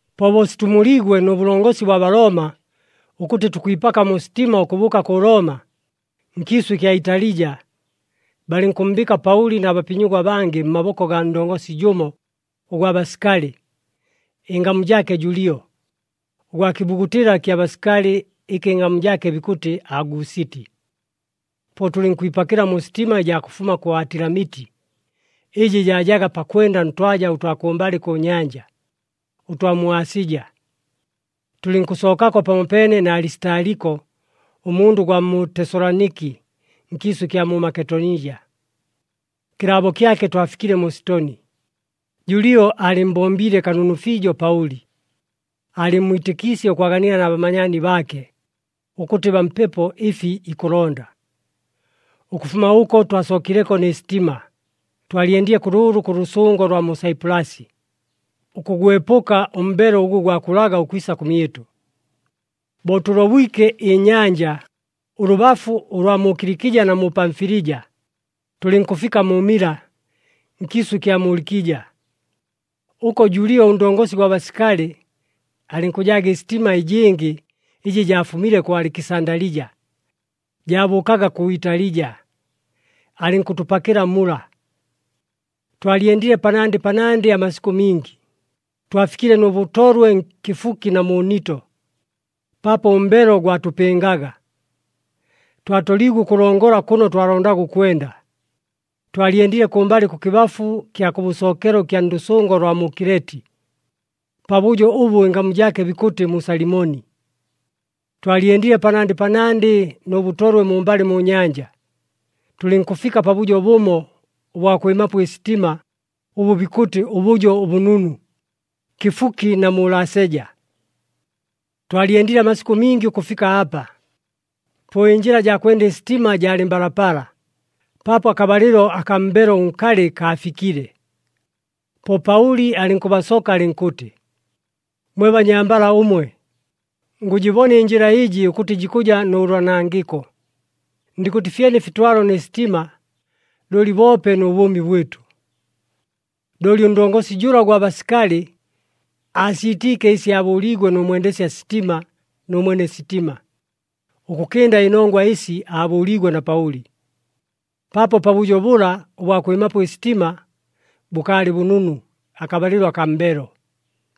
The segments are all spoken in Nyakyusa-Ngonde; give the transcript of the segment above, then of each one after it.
Po bo situmuliigwe nʉ bʉlongosi bwa Balooma ʉkʉtɨ tukwipaka mu sitima ʉkʉbʉʉka kʉ Looma, nkiisʉ ɨkya Italija, balɨnkʉmmbɨɨka Paʉli na bapinyigwa abangɨ mmaboko gaa ndongosi jʉmo ʉgwa basikali, ɨngamu jaake Julio, ʉgwa kɨbugutɨla kya basikali ɨkɨ ɨngamu jaake bikʉtɨ Agusiti. Po tʉlɨnkwipakɨla mu sitima ɨjaa kʉfuma kʉ Atilamiti, ɨjɨ jaajaga pakwenda ntwaja ʉtwa kʉmbalɨ kʉ nyanja, ʉtwa mu Asija. Tʉlɨnkʉsookapo pamopeene na Alisitaliko, ʉmundʉ ʉgwa mu Tesaloniki nkiisʉ ɨkya mu Maketonija. Kɨlaabo kyake twafikile mu Sitoni. Julio aalɨmmbombiile kanunu fiijo Paʉli, aalɨmmwitɨkiisye ʉkwaganila na bamanyaani baake, ʉkʉtɨ bampepo ɨfi ikʉlonda. Ʉkʉfuma ʉko twasookileko nɨ sitima, twalyendile kʉlʉʉlʉ kʉ lʉsʉngo lwa mu Saipulasi, ʉkʉgwepʉka ʉmbelo ʉgʉ gwakulaga ʉkwisa kʉmyɨtʉ. Bo tʉlobwike ɨnyanja ʉlʉbafu ʉlwa mu Kilikija na mu Pamfilija, tʉlɨnkʉfika mu Mila nkiisʉ ɨkya mu Likija. Ʉko Julio ʉndongosi gwa basikali, alɨnkʉjaaga ɨsitima ɨjɨngɨ ɨjɨ jaafumile kʉ Alikisandalija, jaabʉʉkaga kʉ Italija, alɨnkʉtʉpakɨla mula. Twalyendile panandɨ panandɨ amasikʉ mingi, twafikile nʉ bʉtolwe kɨfuki na mu Nito. Paapo ʉmbelo gwatʉpɨngaga, twatoliigwe ʉkʉlongola kʉno twalondaga ʉkwenda, twalyendile kʉmbalɨ kʉkɨbafu kya kʉbʉsookelo ɨkya ndʉsʉngo lwa mu Kileti, pabʉjo ʉbʉ ɨngamu jaake bikʉtɨ mu Salimoni. Twalyendile panandɨ panandɨ nʉ bʉtolwe mumbalɨ mu nyanja, tʉlɨnkʉfika pabʉjo bʉmo ʉbwa kwɨmapo ɨsitima ʉbʉ bikʉtɨ ʉBʉjo ʉBʉnunu, kɨfuki na mu Laseja. Twalyendile amasikʉ mingi ʉkʉfika apa. Po ɨnjɨla jaa kwenda ɨsitima jaalɨ mbalapala, paapo akabalɨlo akaa mbelo ʉnkalɨ kaafikile. Po Paʉli alɨnkʉbasoka alɨnkʉtɨ, “Mwe banyambala ʉmwe, ngʉjɨbona ɨnjɨla ɨjɨ ʉkʉtɨ jikʉja nʉ loonangɨko, ndɨnkʉtɨ fyene ɨfitwalo nɨ sitima, looli boope nʉ bʉʉmi bwɨtʉ.” Looli ʉndongosi jʉla ʉgwa basikali, aasiitiike ɨsi aabʉʉliigwe nʉ mwendesya sitima nʉ mwene sitima, ʉkʉkɨnda ɨnongwa ɨsi aabʉʉliigwe na Paʉli. Paapo pabʉjo bʉla ʉbwa kwɨmapo ɨsitima bʉkaalɨ bʉnunu akabalɨlo akaa mbelo,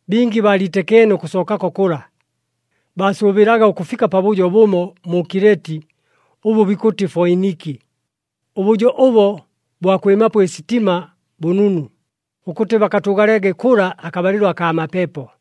bingi baaliitɨkeene ʉkʉsookako kʉla. Baasʉʉbɨlaga ʉkʉfika pabʉjo bʉmo mu Kileti ʉbʉ bikʉtɨ Foiniki, ʉbʉjo ʉbo bwa kwɨmapo ɨsitima bʉnunu, ʉkʉtɨ bakatʉʉgalege kʉla akabalɨlo akaa mapepo.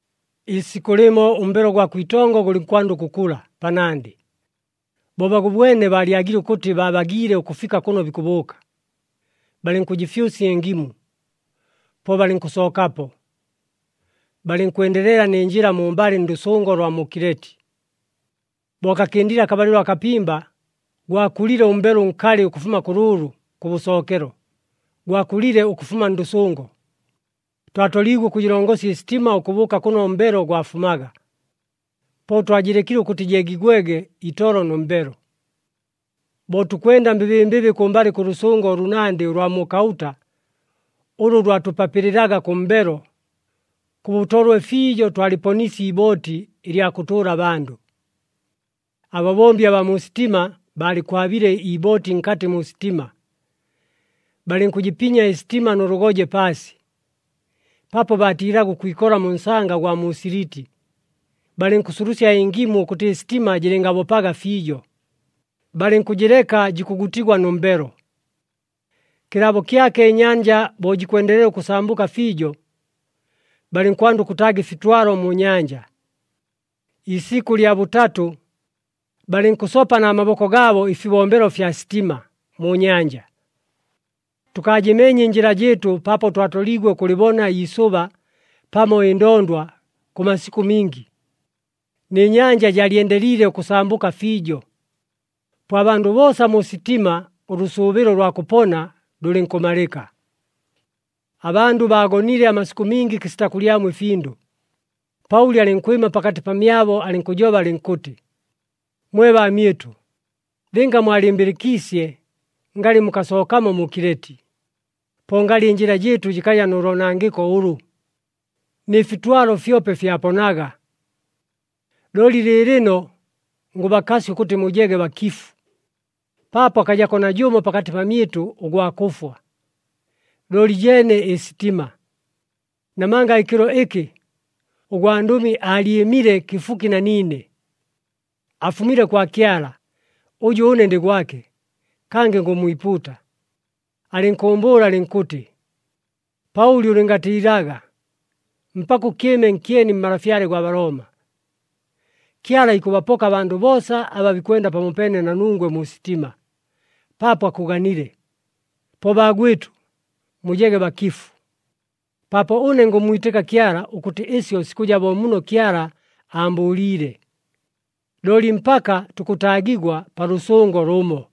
Iisikʉ lɨmo ʉmbelo gwa kwitongo gʉlɨnkwanda ʉkʉkula panandɨ. Bo bagʉbwene baalyagile ʉkʉtɨ babagiile ʉkʉfika kʉno bikʉbʉʉka, balɨnkʉjɨfyʉsya ɨngimu, po balɨnkʉsookapo, balɨnkwendelela nɨ njɨla mumbalɨ ndʉsʉngo lwa mu Kileti. Bo kakɨndile akabalɨlo akapimba, gwakulile ʉmbelo ʉnkalɨ ʉkʉfuma kʉlʉʉlʉ kʉbʉsookelo, gwakulile ʉkʉfuma ndʉsʉngo. Twatoliigwe ʉkʉjɨlongosya ɨsitima ʉkʉbʉʉka kʉno ʉmbelo gwafumaga. Po twajɨlekile ʉkʉtɨ jeegigwege itolo nʉ mbelo. Bo tukwenda mbɨbɨmbɨbɨ kʉmbalɨ kʉ lʉsʉngo ʉlʉnandɨ ʉlwa mu Kaʉta, ʉlʉ lwatʉpapɨlɨlaga kʉ mbelo, kʉ bʉtolwe fiijo twalɨponiisye ibooti ɨlya kʉtʉʉla abandʉ. Ababombi abaa mu sitima baalɨkwabiile ibooti nkatɨ mu sitima, balɨnkʉjɨpinya ɨsitima nʉ lʉgoje paasi. Paapo baatiilaga ʉkwikola mu nsanga ʉgwa mu Siliti, balɨnkʉsulusya ɨngimu ʉkʉtɨ ɨsitima jɨlɨngabopaga fiijo, balɨnkʉjɨleka jikʉgutigwa nʉ mbelo. Kɨlaabo kyake ɨnyanja bo jikwendelela ʉkʉsambʉka fiijo, balɨnkwanda ʉkʉtaaga ɨfitwalo mu nyanja. Iisikʉ lya bʉtatʉ, balɨnkʉsopa na maboko gaabo ɨfibombelo fya sitima mu nyanja. Tʉkaajɨmeenye ɨnjɨla jɨɨtʉ paapo twatoliigwe ʉkʉlɨbona iisʉba pamo ɨndondwa kʉ masikʉ mingi, nɨ nyanja jaalyendeliile ʉkʉsambʉka fiijo. Po abandʉ boosa mu sitima ʉlʉsʉʉbɨlo ʉlwa kʉpona lʉlɨnkʉmalɨka. Abandʉ bo bagonile amasikʉ mingi kɨsita kʉlyamo ɨfindʉ, Paʉli alɨnkwɨma pakatɨ pamyabo alɨnkʉjoba alɨnkʉtɨ, “Mwe baamyɨtʉ, lɨnga mwalɨmbɨlɨkiisye ngalɨ mukasookamo mu Kileti, po ngalɨ ɨnjɨla jɨɨtʉ jɨkaja nʉ loonangɨko ʉlʉ, nɨ fitwalo fyope fyaponaga. Looli lɨɨlɨno ngʉbakasya ʉkʉtɨ mujege bakifu, paapo akajako najʉmo pakatɨ pamyɨtʉ ʉgwa kʉfwa, looli jeene ɨsitima. Namanga ɨkɨlo ɨkɨ ʉgwandʉmi aalyɨmile kɨfuki na niine. Afumile kwa Kyala, ʉjʉ ʉne ndɨ gwake, kangɨ ngʉmmwipuuta. Alɨnkʉʉmbʉʉla alɨnkʉtɨ, ‘Paʉli, ʉlɨngatiilaga! Mpaka ʉkɨɨme nkyeni mmalafyale gwa Balooma. Kyala ikʉbapoka abandʉ boosa aba bikwenda pamopeene na nungwe mu sitima, paapo akʉganile.’ Po baagwɨtʉ, mujege bakifu, paapo ʉne ngʉmmwitɨka Kyala ʉkʉtɨ ɨsyo sikʉja bo muno Kyala aambʉʉliile. Looli mpaka tukʉtaagigwa pa lʉsʉngo lʉmo.”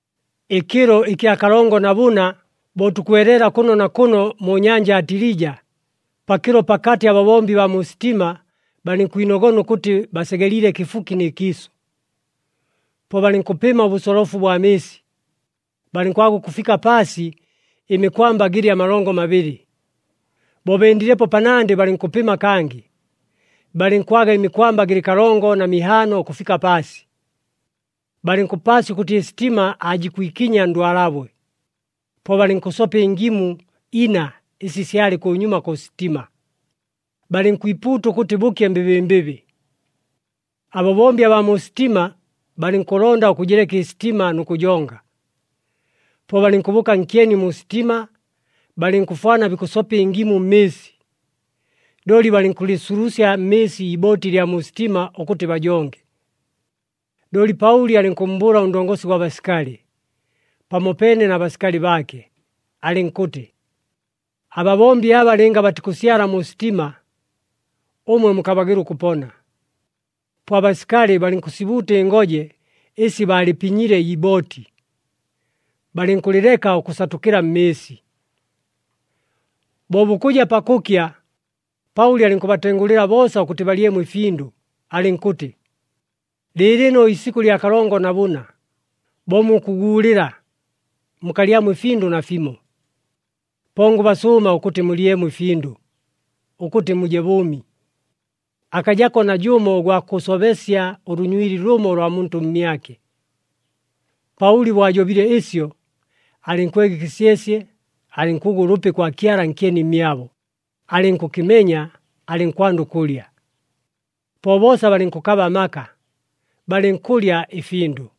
Ɨkɨlo ɨkya kalongo na bʉna bo tukweleela kʉno na kʉno mu nyanja Atilija, pakɨlo pakatɨ ababombi baa mu sitima balɨnkwinogona ʉkʉtɨ basegeliile kɨfuki nɨ kiisʉ. Po balɨnkʉpɨma ʉbʉsolofu bwa mɨɨsi, balɨnkwaga ʉkʉfika paasi ɨmikwamba gɨlɨ amalongo mabɨlɨ. Bo bendilepo panandɨ, balɨnkʉpɨma kangɨ, balɨnkwaga ɨmikwamba gɨlɨ kalongo na mihaano ʉkʉfika paasi. Balɨnkʉpaasya ʉkʉtɨ ɨsitima aajikwikinya ndwalabwe, po balɨnkʉsopa ɨngimu ina ɨsi syalɨ kʉnyuma kʉ sitima, balɨnkwipuuta ʉkʉtɨ bʉkye mbɨbɨmbɨbɨ. Ababombi abaa mu sitima balɨnkʉlonda ʉkʉjɨleka ɨsitima nʉ kʉjonga, po balɨnkʉbʉʉka nkyeni mu sitima, balɨnkʉfwana bikʉsopa ɨngimu mmɨɨsi, looli balɨnkʉlɨsulusya mmɨɨsi ibooti ɨlya mu sitima ʉkʉtɨ bajonge. Looli Paʉli alɨnkʉmmbʉʉla ʉndongosi gwa basikali, pamopeene na basikali baake, alɨnkʉtɨ, “Ababombi aba lɨnga batikʉsyala mu sitima, ʉmwe mukabagɨla ʉkʉpona.” Po abasikali balɨnkʉsibuuta ɨngoje ɨsi baalɨpinyile ibooti, balɨnkʉlɨleka ʉkʉsatʉkɨla mmɨɨsi. Bo bukʉja pakʉkya, Paʉli alɨnkʉbatengʉlɨla boosa ʉkʉtɨ balyemo ɨfindʉ, alɨnkʉtɨ, “Lɨɨlɨno isikʉ lya kalongo na bʉna, bo mukʉguulɨla, mukalyamo ɨfindʉ nafimo. Po ngʉbasʉʉma ʉkʉtɨ mulyemo ɨfindʉ, ʉkʉtɨ muje bʉʉmi. Akajako najʉmo ʉgwa kʉsobesya ʉlʉnywili lʉmo ʉlwa muntʉ mmyake.” Paʉli bo ajobile ɨsyo, alɨnkwega ɨkɨsyesye, alɨnkʉgwa ʉlʉpi kwa Kyala nkyeni mmyabo, alɨnkʉkɨmenya, alɨnkwanda ʉkʉlya. Po boosa balɨnkʉkaba amaka, balɨnkʉlya ɨfindʉ.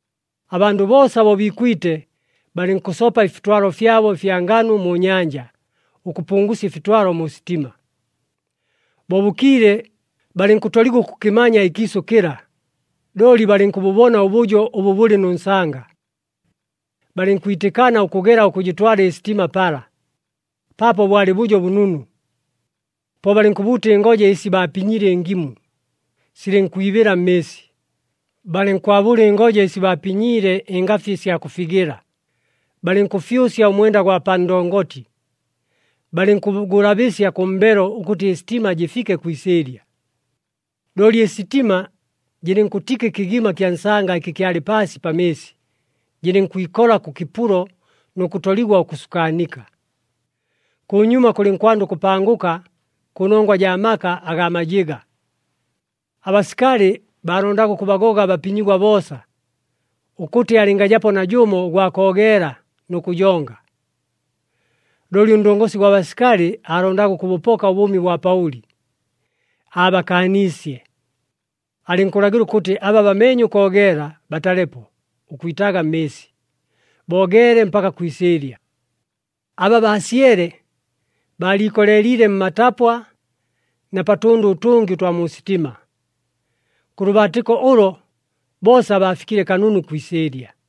Abandʉ boosa bo biikwite, balɨnkʉsopa ɨfitwalo fyabo ɨfya nganu mu nyanja ʉkʉpungusya ɨfitwalo mu sitima. Bo bʉkiile, balɨnkʉtoligwa ʉkʉkɨmanya ɨkiisʉ kɨla, looli balɨnkʉbʉbona ʉbʉjo ʉbʉ bʉlɨ nʉ nsanga, balɨnkwitɨkana ʉkʉgela ʉkʉjɨtwala ɨsitima pala, paapo bwalɨ bʉjo bʉnunu. Po balɨnkʉbuuta ɨngoje ɨsi baapinyiile ɨngimu, silɨnkwibɨla mmɨɨsi, balɨnkwabʉla ɨngoje ɨsi baapinyiile ɨngafi ɨsya kʉfigɨla, balɨnkʉfyʉsya ʉmwenda gwa pa ndongoti, balɨnkʉgʉlabɨsya kʉ mbelo ʉkʉtɨ ɨsitima jɨfike kwi isɨɨlya. Looli ɨsitima jɨlɨnkʉtika ɨkɨgima kya nsanga ɨkɨ kyalɨ paasi pa mɨɨsi. Jɨlɨnkwikola kʉ kɨpulo nʉ kʉtoligwa ʉkʉsukaanika. Kʉnyuma kʉlɨnkwanda ʉkʉpangʉka kʉnongwa jaa maka agaa majɨga. Abasikali baalondaga ʉkʉbagoga abapinyigwa boosa, ʉkʉtɨ alɨngajapo najʉmo ʉgwa koogeela nʉ kʉjonga. Looli ʉndongosi gwa basikali aalondaga ʉkʉbʉpoka ʉbʉʉmi bwa Paʉli, aabakaaniisye. Alɨnkʉlagɨla ʉkʉtɨ aba bameenye ʉkoogeela batalepo ʉkwitaaga mmɨɨsi, boogeele mpaka kwi isɨɨlya. Aba baasyele, baaliikoleeliile mmatapwa na pa tʉndʉ ʉtʉngɨ ʉtwa mu sitima. Kʉ lʉbaatɨko ʉlo boosa baafikile kanunu kwi isɨɨlya.